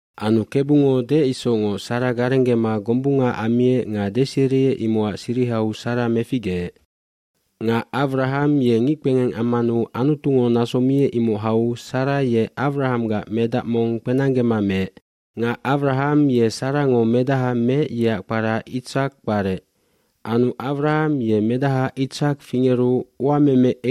aAnu Kebungo deec isocngoc Sara garenggema gombunga ammiec nga deseriec imocac sirihau Sara meficgeec. bNga Awraham ye ngickpengeng ammanu Anutungo naso miec imoc hau Sara ye Awrahamgac medac mong kpenanggema meec. cNga Awraham ye Sarango medaha meec yeac kpara Itsak kparec. dAnu Awraham ye medaha Itsak fingeru uameme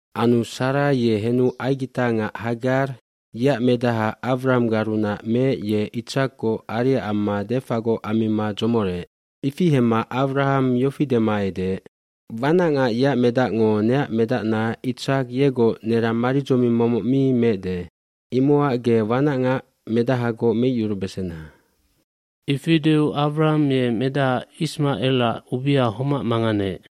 fAnu Sara ye henu aigitangac Hagar yeac medaha Awrahamgarunac meec ye Itsakgoc ariac amma defagoc ammima dzomoreec. gIfi hemma Awraham yofi dema edeec, “Wanacngac yeac medacngo neac medacna Itsak yegoc nerang maridzoming momoc mi mebesandape imocac ge wanacngac medahagoc kporacyuruna kenec.” Ifi deu Awraham ye medaha Ismacelac ubia homac manganeec.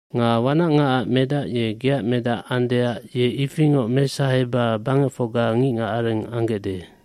iNga wanacngacac medac ye geac medac andeac ye ifingoc mesaheba bangecfocga ngicngacarengtoa ambesandae.”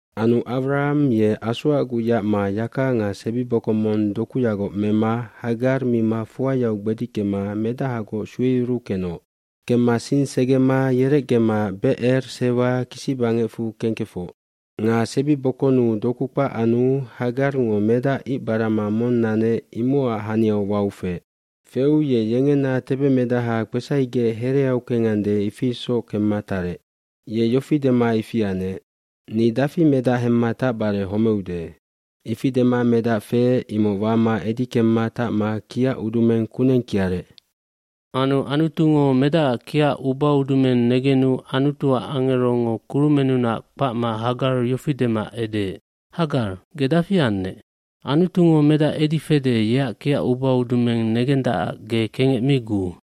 lAnu Awraham ye asoacguc yacma yaka nga sebibokongj mong dokuyagoc mema Hagar mima fuayau gbedickema medahagoc sueyuruu kenoc. Kemma sing segema yerecgema Becer Sewak kisibangecfu kengkefoc. Nga sebibokonnu doku kpac anu Hagarngo medac icbarama mong nanec imocac haniau wau feec. Feu ye yengena tebemedaha kpesaigec hereau kengande ifi isoc kemma tarec. Ye yofi dema ifi anec, “Ni dafi medac hemma tacbare homeude.” Ifi dema medac feec imoc wama edi kemma tacma kiac udumeng kuneng kiarec. Anu Anutungo medacac kiac ubaudumeng negenu Anutuac angerongo kurumennunac kpacma Hagar yofi dema edeec, “Hagar, ge dafi annec? Anutungo medac edi fede yeac kiac ubaudumeng negendacac ge kengec mi guu.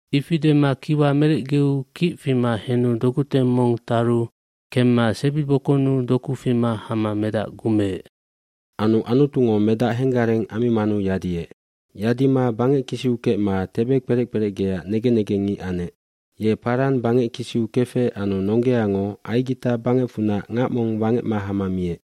Ifi dema kiwa merecgeu kic fima henu dokuteng mong taru kemma sebibokonnu doku fima hama medac gumeec. Anu Anutungo medac henggareng ammimanu yadiec. Yadima bangeckisiu kecma tebe kperec kperecgeac negen negengngic anec. Ye Paran bangeckisiu kefec anu nonggeango Aigita bangecfunac ngac mong wangecma hama miec.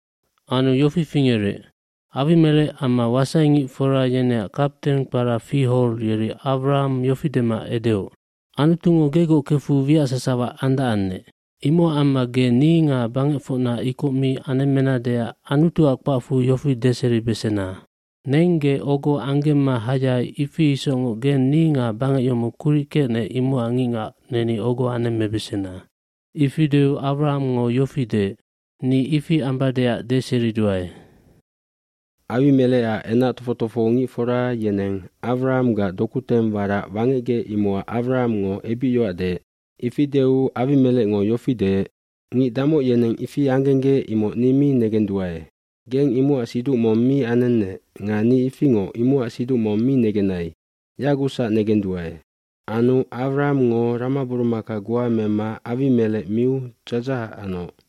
nAnu yofi fingerec, Awimelec amma wasaingicfora yeneac kapten kpara Fihol yeri Awraham yofi dema edeoc, “Anutungo gegoc kefu wiac sasawa andacannec. Imocac amma ge ni nga bangecfocna ikoc mi anemmenadeac Anutuac kpacfu yofi deseribesena. Neng ge ogo anggemma hayai ifi isocngoc geng ni nga bangec yomoc kuric kecnec imocac ngicngac neni ogo anemmebesena.” Ifi deu Awrahamngo yofi deec, “Ni ifi ambadeac deseriduae.” Awimelecac enac tofoc tofohongicfora yeneng Awrahamgac dokuteng warac wangecgec imocac Awrahamngo ebicyoac deec. Ifi deu Awimelecngo yofi deec, “Ngic damoc yeneng ifi anggenggec imoc ni mi negenduae. Geng imocac siduc mong mi anennec nga ni ifingoc imocac siduc mong mi negenai yagucsac negenduae.” Anu Awrahamngo ramaburumaka goa mema Awimelec miu dzadzahac anoc.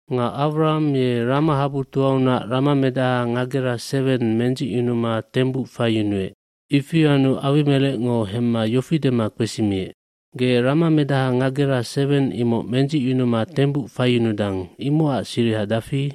Nga Awraham ye ramahabutoaunac ramamedaha ngagera seweng mendzicyunuma tembuc faiyunuec. Ifi anu Awimelecngo hemma yofi dema kpesimiec, “Ge ramamedaha ngagera seweng imoc mendzicyunuma tembuc faiyunudang, imocac siriha dafi?”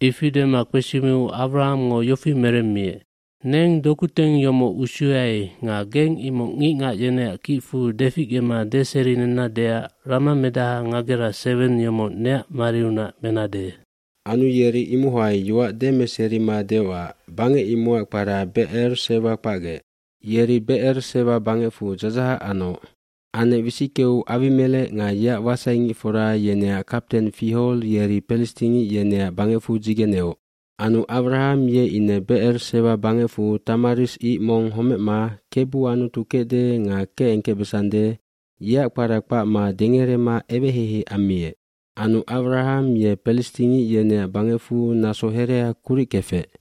Ifi dema kpesimiu Awrahamngo yofi meremmiec, “Neng dokuteng yomoc usuyai nga geng imoc ngicngac yeneac kicfu deficgema deserinennadeac ramamedaha ngagera seweng yomoc neac mariunac menade.” Anu yeri imohai yoac demeserima deocac bangec imocac kpara Becer Sewa kpacgec. Yeri Becer Sewa bangecfu dzadzahac anoc. Anec wisickeu Awimelec nga yeac wasaingicfora yeneac kapten Fihol yeri pelistingic yeneac bangecfu dzigeneoc. Anu Awraham ye ine Becer Sewa bangecfu tamarisk ico mong homecma Kebu Anutu kecde nga kecengkecbesande yeac kpara kpacma dengerema eweheihei ammiec. Anu Awraham ye pelistingic yeneac bangecfu naso herea kuric kefec.